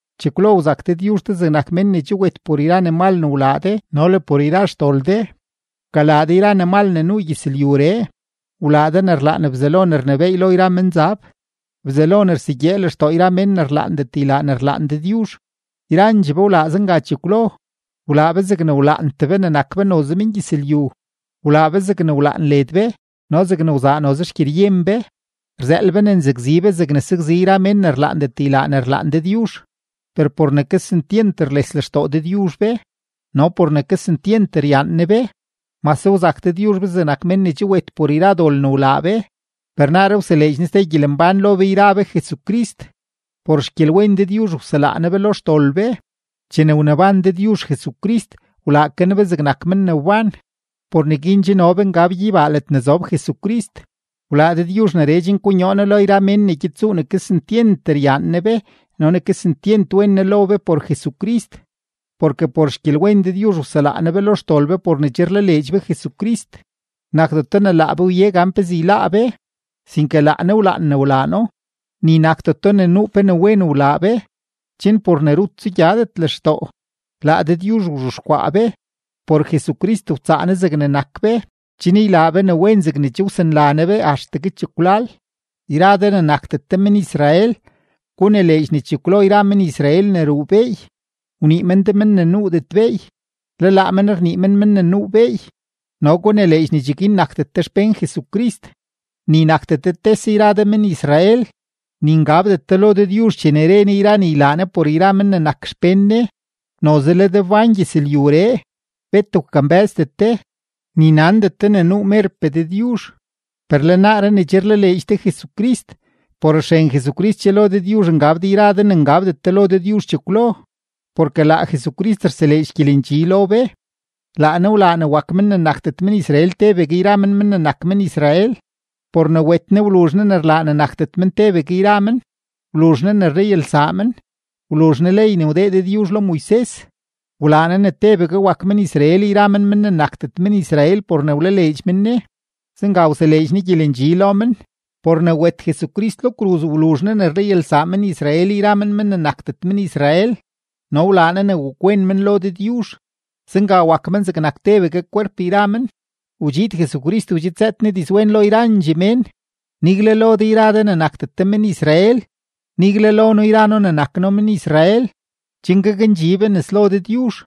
Chekwlo wzak Dëdyuzh de zegnak men ne che wet por yra ne mal ne wlaa de no le por yra xdol de, wkalaa de yra ne mal ne nuu gyëzlyuree, wlaa de ne rlaan Bzelo ne rnebééy lo yra menzab, Bzelo ne rsegyee lextoo yra mén ne rlaandet ylaa ne rlaan Dëdyuzh. Yrandxee be wlaa zenga chekwlo, wlaa be zegne wlaantee be ne nak be noze mengyëzlyu, wlaa be zegne wlaan led be no zegne wzaa noze xgyeryen be, rzëël be ne nzakzi be zegne sakzi yra mén ne rlaandet ylaa ne rlaan Dëdyuzh. Per por ne kesentyent rles lextoo Dëdyuzh be no por ne kesentyent ryaan Ne be, mase wzak Dëdyuzh be zegnak men ne che wet por yra dol ne wlaa be, per naaree wseleedx Ne ste gyelembán lo be yra be Jesucrist. Por xgyelwen Dëdyuzh wselaa Ne be lo xdol be. Chene wneban Dëdyuzh Jesucrist, wlaa ke Ne be zegnak men ne wban, por neguin che no be ngab gyeybaa ledne zob Jesucrist. Wlaa Dëdyuzh neree chen konyoo Ne lo yra mén ne gyed tsuu ne kesentyent ryaan Ne be no ne kesentyent wen Ne lo be por Jesucrist. Porke por xgyelwen Dëdyuzh wselaa Ne be lo xdol be por ne che rlaleedx be Jesucrist. Nakdeto ne laa be wye gan pezee yláá be, sinke laa Ne wlaan ne wlaa No. Ni nakdeto ne nuu pe ne wen wlaa be, chen por ne rut tsugyadet lextoo. Laa Dëdyuzh wzhexkwaa be; por Jesucrist wtsaa Ne zegne nak be, chen ylaa be ne wen zegne che wsanla Ne be axtegue chekwlal. Yra de ne nakdet de men-Israel, gunileedx ne chekwlo yra men-Israel ne ruu beey, wnii men de men ne nuudet beey, le laa men rnii men men ne nuu beey. No gunileedx ne cheguin nakdet de xpén Jesucrist, ni nakdet de tese yra de men-Israel, ni ngabdet de lo Dëdyuzh chene re Ne yra ne ylaa Ne por yra men ne nak xpén Ne. Noze le de wbán gyëzlyuree, bet wkambë́zdet de, ni nandet de ne nuu merpee Dëdyuzh. Per le naaree ne che rlaleedx de Jesucrist, por xren Jesucrist che lo Dëdyuzh ngab de yra de ne ngabdet de lo Dëdyuzh chekwlo. Porke laa Jesucrist rseleedx gyelendxi lo be. Laa Ne wlaa ne wak men ne nakdet men-Israel tebegue yra men men ne nak men-Israel. Por ne wet Ne wluzh Ne ne rlaa ne nakdet men tebegue yra men, wluzh Ne ne rlayalsaa men, wluzh Ne ley ne wdee Dëdyuzh lo Moises, wlaa Ne ne tebegue wak men-Israel yra men men ne nakdet men-Israel por ne wlaleedx men Ne. Zenga wseleedx Ne gyelendxi lo men. Por ne wet Jesucrist lo kruz, wluzh Ne ne rlayalsaa men-Israel yra men men ne nakdet men-Israel no wlaa Ne ne wakwen men lo Dëdyuzh, zenga wak men zegnak tebegue kwerp yra men. Wdxiid Jesucrist wdxidzëët Ne dizwen lo yrandxee mén, nigle lo de yra de ne nakdet de men-Israel, nigle lo noo yra noo ne nak noo men-Israel, chen gakndxi be nes lo Dëdyuzh,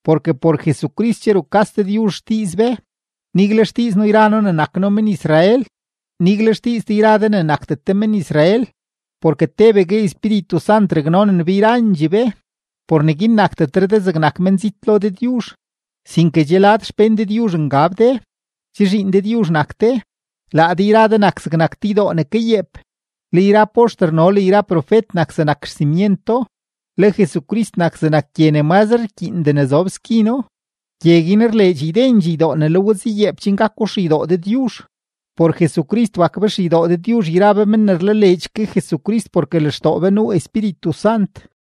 porke por Jesucrist che rukas Dëdyuzh xdiiz be, nigle xdiiz noo yra noo ne nak noo men-Israel, nigle xdiiz de yra de ne nakdet de men-Israel, porke tebegue Espíritu Sant raknonen be yrandxee be. Por neguin nakdetre de zegnak menzit lo Dëdyuzh, sinke che lad xpén Dëdyuzh ngab de, che zhiin Dëdyuzh nak de. Laa de yra de nak zegnak te ydoo ne kayeep, le yra poxter no le yra profet nak zegnak xsimyento, le Jesucrist nak zegnak gye ne mazre rkyiindee ne zob skino. Gye guin rleedx ydendxee ydoo ne le we zayeep chen gako xeydoo Dëdyuzh. Por Jesucrist wak be xeydoo Dëdyuzh yra be men ne rlaleedx ke Jesucrist porke lextoo be nuu Espíritu Sant.